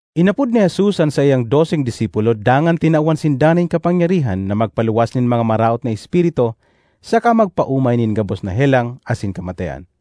Inapod ni Jesus an saiyang doseng disipulo dangan tinawan sinda nin kapangyarihan na magpaluwas nin mga maraot na espiritu saka magpaomay nin gabos na helang asin kamatean.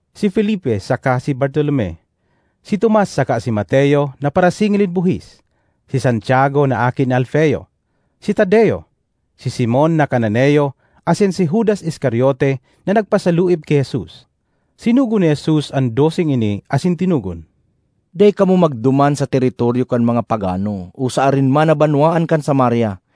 si Felipe saka si Bartolome; si Tomas saka si Mateo na parasingil nin buhis; si Santiago na aki ni Alfeo; si Tadeo; si Simon na Cananeo asin si Judas Iscariote na nagpasaluib ki Jesus. Sinugo ni Jesus an doseng ini asin tinugon, “Dai kamo magduman sa teritoryo kan mga pagano o sa arin man na banwaan kan Samaria.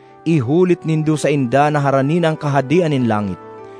Ihulit nindo sainda na harani na an Kahadean nin langit!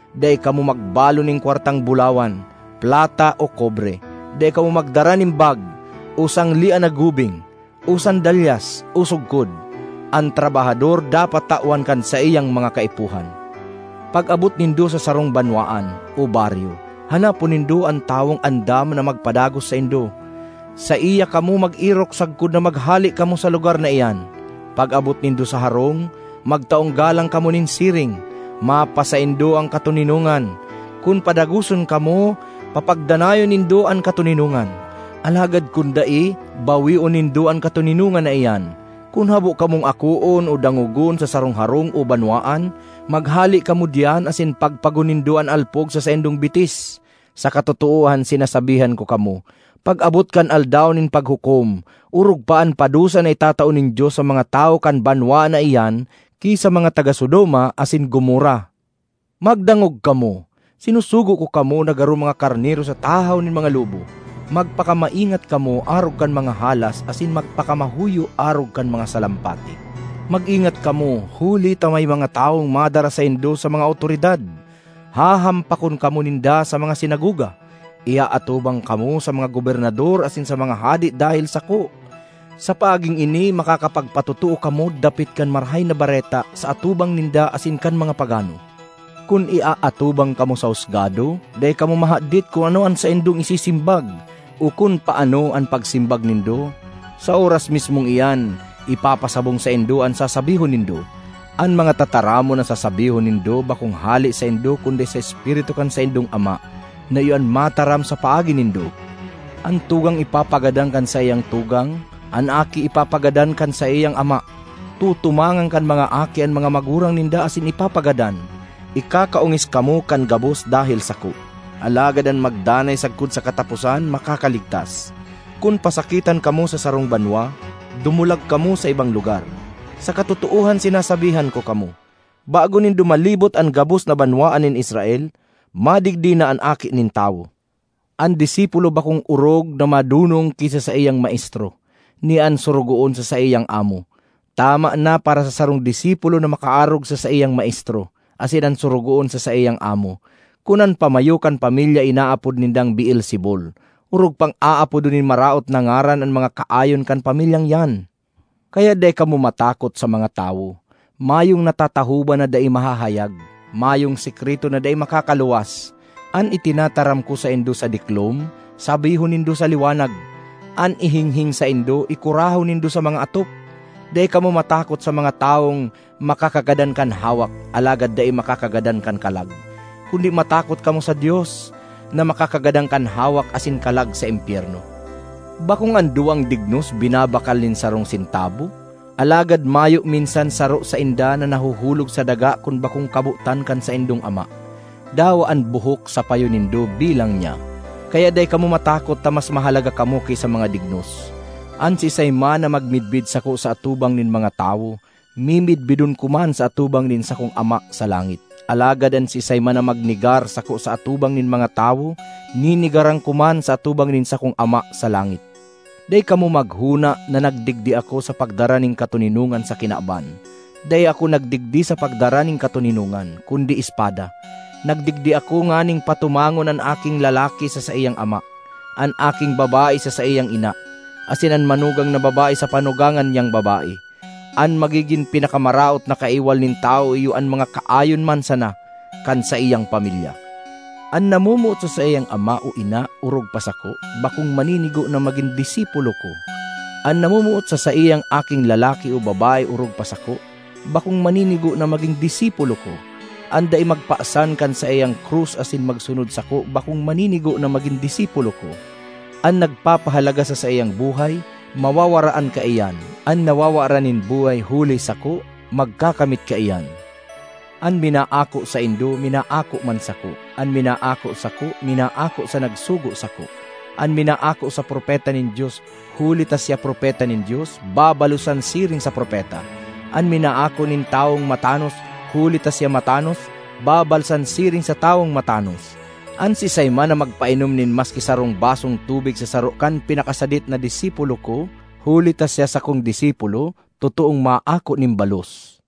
Dai kamo magbalon nin kwartang bulawan, plata o kobre. Dai kamo magdara nin bag, o sanglean na gubing, o sandalyas, o sugkod. An trabahador dapat tawan kan saiyang mga kaipuhan. ”Pag-abot nindo sa sarong banwaan o baryo, hanapon nindo an tawong andam na magpadagos saindo; saiya kamo mag-erok sagkod na maghale kamo sa lugar na iyan. Pag-abot nindo sa harong, magtaong galang kamo nin siring, ‘Mapasaindo an katoninongan.’ Kun padagoson kamo, papagdanayon nindo an katoninongan; alagad kun dai, baweon nindo an katoninongan na iyan. Kun habo kamong akoon o dangogon sa sarong harong o banwaan, maghale kamo diyan asin pagpagon nindo an alpog sa saindong bitis. Sa katotoohan sinasabihan ko kamo, pag-abot kan Aldaw nin Paghukom, orog pa an padusa na itatao nin Dios sa mga tawo kan banwaan na iyan ki sa mga taga Sodoma asin Gomorra! ”Magdangog kamo! Sinusugo ko kamo na garo mga karnero sa tahaw nin mga lobo. Magpakamaingat kamo arog kan mga halas asin magpakamahoyo arog kan mga salampati. Mag-ingat kamo, huli ta may mga tawong madara saindo sa mga awtoridad. Hahampakon kamo ninda sa mga sinagoga. Iaatubang kamo sa mga gobernador asin sa mga hade dahel sako; sa paaging ini makakapagpatotoo kamo dapit kan Marahay na Bareta sa atubang ninda asin kan mga pagano. Kun iaatubang kamo sa husgado, dai kamo mahadit kun ano an saindong isisimbag o kun paano an pagsimbag nindo. Sa oras mismong iyan, ipapasabong saindo an sasabihon nindo. An mga tataramon na sasabihon nindo bakong hale saindo kundi sa Espiritu kan saindong Ama na iyo an mataram sa paagi nindo. ”An tugang ipapagadan kan saiyang tugang. An aki ipapagadan kan saiyang ama; tutumangan kan mga aki an mga magurang ninda asin ipapagadan. Ikakaongis kamo kan gabos dahel sako. Alagad an magdanay sagkod sa kataposan makakaligtas. Kun pasakitan kamo sa sarong banwa, dumulag kamo sa ibang lugar. Sa katotoohan sinasabihan ko kamo, bago nindo malibot an gabos na banwaan nin Israel, madigdi na an Aki nin Tawo. ”An disipulo bakong orog na madonong ki sa saiyang maestro; ni an sorogoon sa saiyang amo. Tama na para sa sarong disipulo na makaarog sa saiyang maestro; asin an sorogoon, sa saiyang amo. Kun an pamayo kan pamilya inaapod nindang Beelzebul, orog pang aapodon nin maraot na ngaran an mga kaayon kan pamilyang iyan! ”Kaya dai kamo matakot sa mga tawo. Mayong natatahoban na dai mahahayag; mayong sekreto na dai makakaluwas. An itinataram ko saindo sa diklom, sabihon nindo sa liwanag; an ihinghing saindo, ikurahaw nindo sa mga atop. Dai kamo matakot sa mga tawong makakagadan kan hawak alagad dai makakagadan kan kalag; kundi matakot kamo sa Dios na makakagadan kan hawak asin kalag sa impyerno. Bakong an duwang dignos binabakal nin sarong sentabo? Alagad mayo minsan saro sainda na nahuhulog sa daga kun bakong kabotan kan saindong Ama. Dawa an buhok sa payo nindo, bilang niya. Kaya dai kamo matakot ta mas mahalaga kamo ki sa mga dignos! ”An siisay man na magmidbid sako sa atubang nin mga tawo, mimidbidon ko man sa atubang nin sakong Ama sa langit. Alagad an siisay man na magnegar sako sa atubang nin mga tawo, nenegaran ko man sa atubang nin sakong Ama sa langit. ”Dai kamo maghona na nagdigdi ako sa pagdara nin katoninongan sa kinaban; dai ako nagdigdi sa pagdara nin katoninongan, kundi espada. Nagdigdi ako nganing patumangon an aking lalaki sa saiyang ama, an aking babae sa saiyang ina, asin an manugang na babae sa panugangan niyang babae. An magigin pinakamaraot na kaiwal nin tawo iyo an mga kaayon man sana kan saiyang pamilya. ”An namomoot sa saiyang ama o ina orog pa sako, bakong maninigo na magin disipulo ko. An namomoot sa saiyang aking lalaki o babae orog pa sako, bakong maninigo na magin disipulo ko. An dai magpasan kan saiyang krus asin magsunod sako bakong maninigo na magin disipulo ko. An nagpapahalaga sa saiyang buhay, mawawaraan kaiyan; an nawawaran nin buhay huli sako, magkakamit kaiyan. ”An minaako saindo, minaako man sako; an minaako sako, minaako sa nagsugo sako. An minaako sa propeta nin Dios huli ta siya propeta nin Dios, babalosan siring sa propeta. An minaako nin tawong matanos huli ta siya matanos, babalsan siring sa tawong matanos. An siisay man na magpainom nin maski sarong basong tubig sa saro kan pinakasadit na disipulo ko huli ta siya sakong disipulo, totoong maako nin balos.”